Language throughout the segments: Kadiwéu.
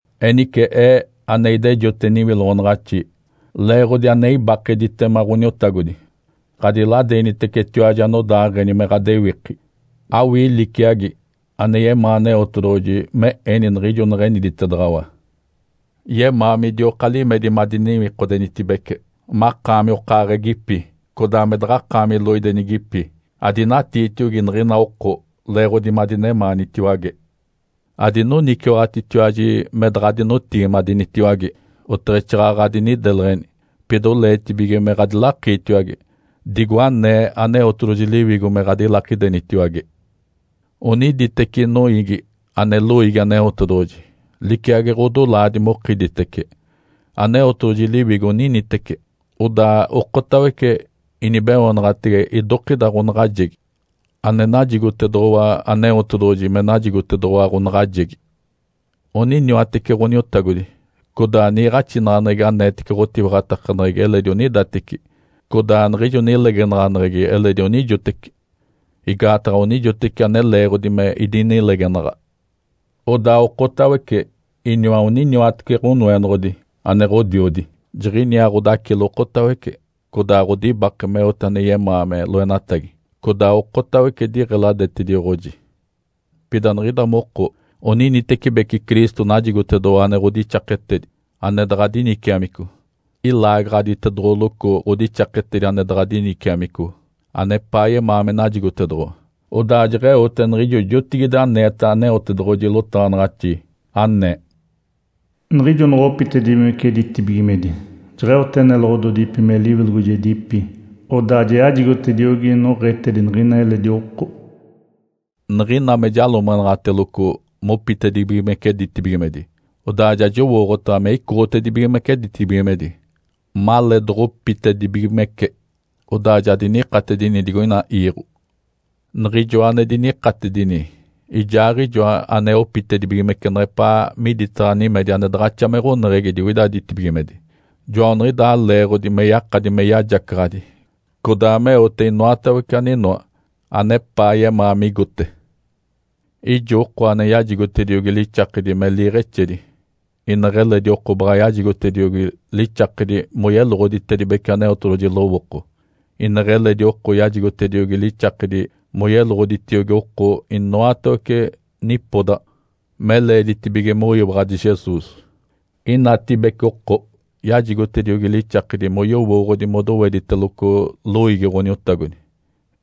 Enice ee, ane idejote niwiloɡ̶onaɡ̶axi leeɡ̶odi ane ibakeditema Ǥoniotagodi, ɡ̶adiladeenitecetiwaji anodaaɡ̶eni me ɡ̶adewiki, awii liciagi ane yemaa Aneotedoɡ̶oji me eni niɡ̶ijo neɡ̶eniditedaɡ̶awa. Yemaa midioka limedi madiniwikodenitibece, makaami okaaɡ̶egipi, codaa me daɡ̶akaami loidenigipi. Adinatiitiogi niɡ̶ina oko leeɡ̶odi madinemaanitiwage. Adinoniciwaɡ̶atitiwaji me daɡ̶adinotigimadenitiwage, oteɡ̶exaaɡ̶aɡ̶a adinideleɡ̶eni, pida oleetibige me ɡ̶adilakiitiwage, digo anee Aneotedoɡ̶oji Liwigo me ɡ̶adilakidenitiwage. Oniditeci noiigi ane loiigi Aneotedoɡ̶oji, liciagi ɡ̶odolaadi mokiditece. Aneotedoɡ̶oji Liwigo oninitece, odaa okotawece inibeoonaɡ̶atege idokida ɡ̶onaɡ̶ajegi, aneniditedoɡ̶owa Aneotedoɡ̶oji me najigotedoɡ̶owa ɡ̶onaɡ̶ajegi. Oniniwatece Ǥoniotagodi, codaa niiɡ̶axinaɡ̶aneɡ̶egi aneetece ɡ̶otiwaɡ̶atakaneɡ̶egi eledi onidateci, codaa niɡ̶ijo nilegenaɡ̶aneɡ̶egi eledi onijoteci, igaataɡ̶a onijoteci ane leeɡ̶odi me idinilegenaɡ̶a. Odaa okotawece iniwa oniniwatece Ǥonoenoɡ̶odi ane Ǥodiodi. Jiɡ̶iniaa Ǥodacilo okotawece, codaa ɡ̶odibake meote ane yemaa me loenatagi, codaa okotawece diɡ̶eladetedioɡ̶oji. Pida niɡ̶ida moko oninitecibeci Cristo najigotedoɡ̶owa ane ɡ̶odixaketedi, ane daɡ̶a diniciamico. Ilaagaɡ̶aditedoɡ̶oloco ɡ̶odixaketedi ane daɡ̶a diniciamico, anepaa yemaa me najigotedoɡ̶owa. Odaa jeɡ̶eote niɡ̶ijo jotigide aneeta Aneotedoɡ̶oji lotaɡ̶anaɡ̶axi, anee, “Niɡ̶ijo noɡ̶opitedibigimece ditibigimedi, jeɡ̶eote neloɡ̶ododipi me liwilogojedipi. Odaa ja yajigotediogi noɡ̶etedi niɡ̶ina eledi oko.” Niɡ̶ina me jalomeɡ̶enaɡ̶ateloco mopitedibigimece ditibigimedi, odaa ja jowooɡ̶otaɡ̶a me icoɡ̶otibigimece ditibigimedi maleedoɡ̶opitedibigimece. Odaa ja dinikatedinigi digoina iiɡ̶o. Niɡ̶ijoa ane dinikatedini, Ijaaɡ̶ijoa anopitedibigimece neɡ̶epaa miditaɡ̶a nimedi ane daɡ̶axa me ɡ̶oneɡ̶egi digoida ditibigimedi. Joaniɡ̶idaa leeɡ̶odi me yakadi me yajacaɡ̶adi codaa meote inoatawece aninoa anepaa yemaa migote. Ijo oko ane yajigotediogi lixakedi me liiɡ̶exedi, ineɡ̶eledi oko baɡ̶a yajigotediogi lixakedi moyeloɡ̶oditedibece Aneotedoɡ̶oji lowooko, ineɡ̶eledi oko yajigotediogi lixakedi moyeloɡ̶oditiogi oko inoatawece nipodaɡ̶a me leeditibige moyiwaɡ̶adi Jesus. Inatibece oko yajigotediogi lixakedi moyowooɡ̶odi modowediteloco loiigi Ǥoniotagodi,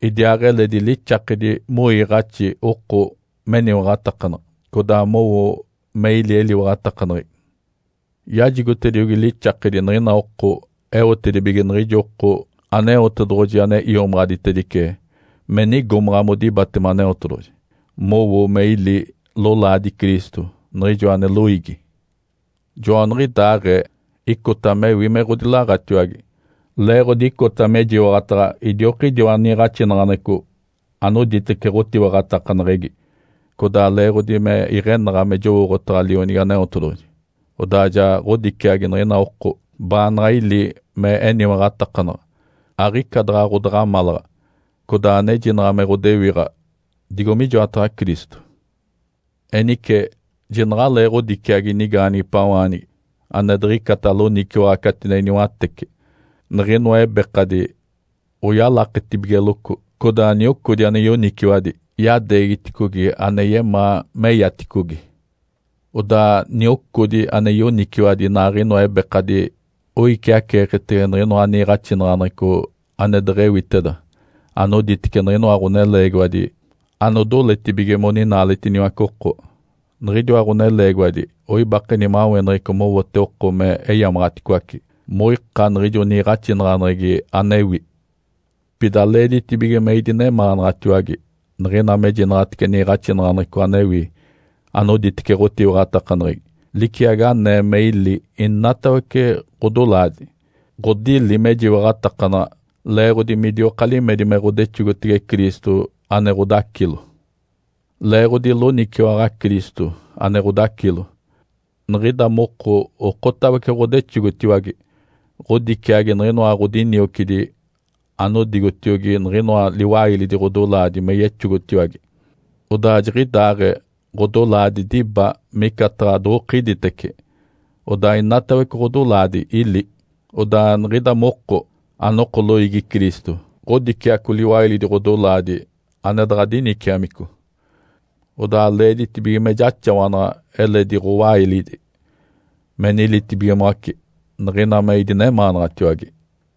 idiaaɡ̶eledi lixakedi moiiɡ̶axi oko meniwaɡ̶atakanaɡ̶a, codaa mowo me ili eliwaɡ̶atakaneɡ̶egi. Yajigotediogi lixaketedi niɡ̶ina oko eotedibige niɡ̶ijo oko Aneotedoɡ̶oji ane iomaɡ̶aditedice me nigomaɡ̶a modibatema Aneotedoɡ̶oji, mowo me ili lolaadi Cristo, niɡ̶ijo ane loiigi. Joaniɡ̶idaaɡ̶ee icota mewi me ɡ̶odilaɡ̶atiwage, leeɡ̶odi icota mejiwaɡ̶ataɡ̶a idiokidiwa niiɡ̶axinaɡ̶aneɡ̶eco anoditece ɡ̶otiwaɡ̶atakaneɡ̶egi, codaa leeɡ̶odi me iɡ̶enaɡ̶a me jowooɡ̶otaɡ̶a Lionigi Aneotedoɡ̶oji. Odaa ja ɡ̶odiciagi niɡ̶ina oko baanaɡ̶a ili me eniwaɡ̶atakanaɡ̶a, aɡ̶ica daɡ̶a ɡ̶odaɡ̶amalaɡ̶a, codaa anejinaɡ̶a me ɡ̶odewiɡ̶a digo mijoataɡ̶a Cristo. Enice jinaɡ̶alee ɡ̶odiciagi nigaanigipawaanigi ane diɡ̶icata loniciwaɡ̶a catinedi niwatece, niɡ̶inoa ebekadi oyalaketibigeloco, codaa niocodi ane yoniciwadi yadeegiticogi ane yemaa meyaticogi. Odaa niocodi ane yoniciwadi inaaɡ̶inoa ebekadi oiciaceeketege niɡ̶inoa niiɡ̶axinaɡ̶aneɡ̶eco ane deɡ̶ewiteda anoditece niɡ̶inoa ɡ̶oneleegiwadi anodoletibige moninaaletiniwace oko. Niɡ̶idiwa ɡ̶oneleegiwadi oibake nimaweneɡ̶eco mowote oko me eyamaɡ̶aticoace, moika niɡ̶ijo niiɡ̶axinaɡ̶aneɡ̶egi anewi. Pida leeditibige me idinemaanaɡ̶atiwage niɡ̶ina mejinaɡ̶atece niiɡ̶axinaɡ̶aneɡ̶eco anewi anoditece ɡ̶otiwaɡ̶atakaneɡ̶egi. Liciagi anee me ili inatawece ɡ̶odolaadi, ɡ̶odili mejiwaɡ̶atakanaɡ̶a leeɡ̶odi midioka limedi me ɡ̶odexogotege Cristo ane Ǥodacilo. Leeɡ̶odi loniciwaɡ̶a Cristo, ane Ǥodacilo, niɡ̶ida moko okotawece ɡ̶odexogotiwage, ɡ̶odiciagi niɡ̶inoa ɡ̶odiniocidi anodigotiogi niɡ̶inoa liwailidi ɡ̶odolaadi me yexogotiwage, odaa jiɡ̶idaaɡ̶ee ɡ̶odolaadi diba micataɡ̶a doɡ̶okiditece, odaa inatawece ɡ̶odolaadi ili. Odaa niɡ̶ida moko, anoko loiigi Cristo, ɡ̶odiciaco liwailidi ɡ̶odolaadi ane daɡ̶a diniciamico. Odaa leeditibige me jaxawanaɡ̶a eletidi ɡ̶owailidi me nilitibigimoace, niɡ̶ina me idinemaanaɡ̶atiwage.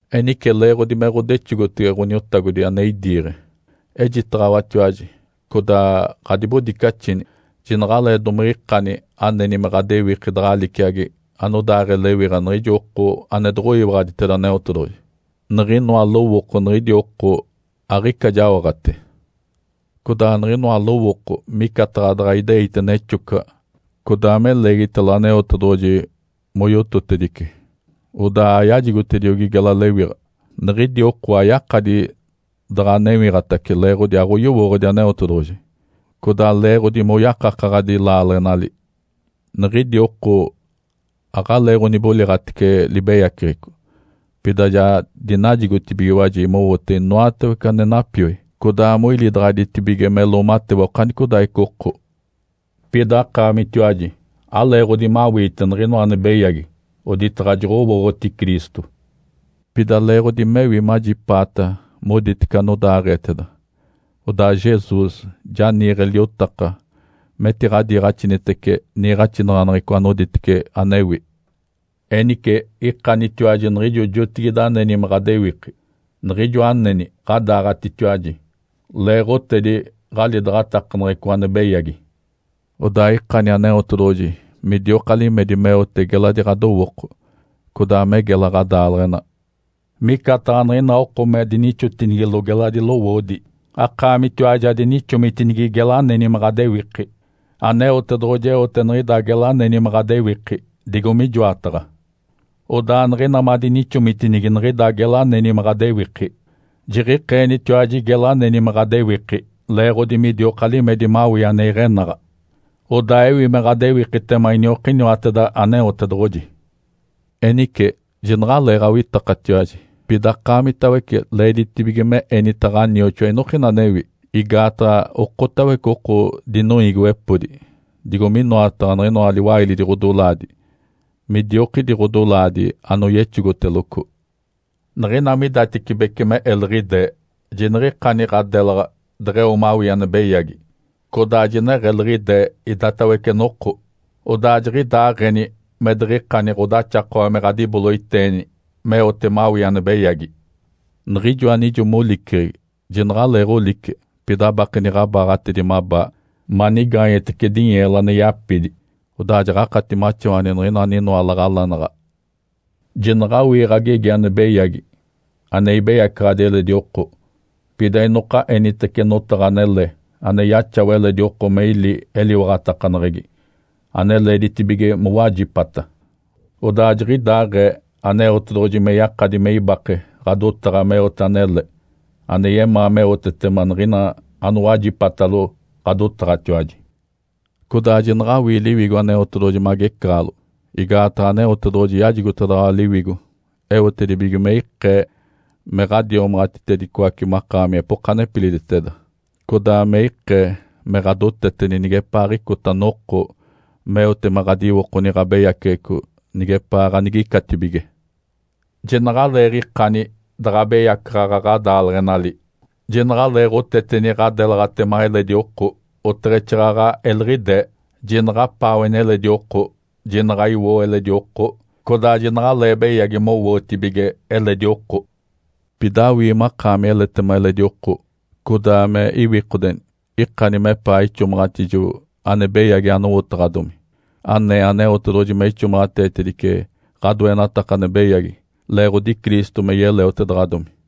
Enice, leeɡ̶odi me ɡ̶odexogotege Ǥoniotagodi ane idiiɡ̶e, ejitaɡ̶awatiwaji, codaa ɡ̶adibodicaxini. Jinaɡ̶alee domiɡ̶ikani aneni me ɡ̶adewiki daɡ̶a liciagi anodaaɡ̶ee lewiɡ̶a niɡ̶ijo oko ane doɡ̶oyowooɡ̶oditeda Aneotedoɡ̶oji. Niɡ̶inoa lowooko niɡ̶idi oko aɡ̶ica jaoɡ̶ate. Codaa niɡ̶inoa lowooko micataɡ̶a daɡ̶a ideite nexocaɡ̶a, codaa me leegitalo Aneotedoɡ̶oji moyototedice, odaa ayajigotediogi gela lewiɡ̶a. Niɡ̶idi oko ayakadi daɡ̶a newiɡ̶atace leeɡ̶odi aɡ̶oyowooɡ̶odi Aneotedoɡ̶oji, codaa leeɡ̶odi moyakakaɡ̶adi laaleɡ̶enali. Niɡ̶idi oko aɡ̶aleeɡ̶oniboliɡ̶atece libeyaceɡ̶eco, pida ja dinajigotibigiwaji mowote inoatawece ane napioi, codaa moilidaɡ̶aditibige me loomatewa okanicodaaɡ̶ica oko. Pida akaamitiwaji aleeɡ̶odi mawiite niɡ̶inoa ane beyagi oditaɡ̶a joɡ̶owooɡ̶oti Cristo. Pida leeɡ̶odi mewi majipaata moditece anodaaɡ̶eeteda. Odaa Jesus ja niiɡ̶e liotaka metiɡ̶adiiɡ̶axinitece niiɡ̶axinaɡ̶aneɡ̶eco anoditece anewi. Enice ikanitiwaji niɡ̶ijo jotigide aneni me ɡ̶adewiki, niɡ̶ijo aneni ɡ̶adaaɡ̶atitiwaji leeɡ̶otedi ɡ̶alidaɡ̶atakaneɡ̶eco ane beyagi. Odaa ikani Aneotedoɡ̶oji midioka limedi meote geladi ɡ̶adowooko, codaa me gela ɡ̶adaaleɡ̶ena. Micataɡ̶a niɡ̶ina oko me dinixotinigilo geladi lowoodi, akaamitiwaji adinixomitinigi gela aneni me ɡ̶adewiki. Aneotedoɡ̶oji eote niɡ̶ida gela aneni me ɡ̶adewiki digo mijoataɡ̶a. Odaa niɡ̶ina madinixomitinigi niɡ̶ida gela aneni me ɡ̶adewiki, jiɡ̶ikeenitiwaji gela aneni me ɡ̶adewiki leeɡ̶odi midioka limedi mawii ane iɡ̶enaɡ̶a, odaa ewi me ɡ̶adewikitema iniokiniwateda Aneotedoɡ̶oji. Enice, jinaɡ̶aleeɡ̶awitakatiwaji. Pida akaamitawece leeditibige me enita ɡ̶anioxoa inokina anewi, igaataɡ̶a okotawece oko dinoiigiwepodi digo minoataɡ̶a niɡ̶inoa liwailidi ɡ̶odolaadi midiokidi ɡ̶odolaadi anoyexogoteloco. Niɡ̶ina midatecibece me eliɡ̶idee, jiniɡ̶ikani ɡ̶adelaɡ̶a deɡ̶eo mawii ane beyagi. Codaa jineɡ̶eliɡ̶idee idatawece noko. Odaa jiɡ̶idaaɡ̶eni me diɡ̶ikani ɡ̶odaxakawa me ɡ̶adiboloiteeni meote mawii ane beyagi. Niɡ̶ijo anijo moliceɡ̶egi, jinaɡ̶aleeɡ̶olice, pida abakeni ɡ̶abaaɡ̶atedi mabaa manigaanyetece dinyeelo ane yapidi. Odaa jaɡ̶akati maxawani niɡ̶ina aninoa laɡ̶alanaɡ̶a. Jinaɡ̶awii ɡ̶agegi ane beyagi, ane ibeyacaɡ̶adi eledi oko. Pida inoka enitece notaɡ̶a anele ane yaxawa eledi oko me ili eliwaɡ̶atakaneɡ̶egi, ane leeditibige mowajipata. Odaa jiɡ̶idaaɡ̶ee Aneotedoɡ̶oji me yakadi me ibake ɡ̶adotaɡ̶a meote anele ane yemaa meotetema niɡ̶ina anowajipatalo ɡ̶adotaɡ̶atiwaji. Codaa jinaɡ̶awii Liwigo Aneotedoɡ̶oji me agecaɡ̶alo. Igaataɡ̶a Aneotedoɡ̶oji yajigotedaɡ̶awa Liwigo eotedibige me ikee me ɡ̶adiomaɡ̶atitedicoace makaami epoka nepiliditeda, codaa me ikee me ɡ̶adoteteni nigepaaɡ̶icota noko meote me ɡ̶adiwokoni ɡ̶abeyaceɡ̶eco nigepaa ganigicatibige. Jinaɡ̶aleeɡ̶ikani daɡ̶a abeyaceɡ̶e ɡ̶adaaleɡ̶enali, jinaɡ̶aleeɡ̶oteteni ɡ̶adelaɡ̶atema eledi oko, oteɡ̶exaaɡ̶aɡ̶a eliɡ̶idee. Jinaɡ̶apaaweni eledi oko, jinaɡ̶a iwoo eledi oko, codaa jinaɡ̶alee beyagi mowootibige eledi oko. Pida awii makaami eletema eledi oko, codaa me iwikodeni. Ikani mepaa ixomaɡ̶atijo ane beyagi anowotaɡ̶adomi, anee Aneotedoɡ̶oji me ixomaɡ̶ateetedice ɡ̶adoenataka ane beyagi leeɡ̶odi Cristo me yeleotedaɡ̶adomi.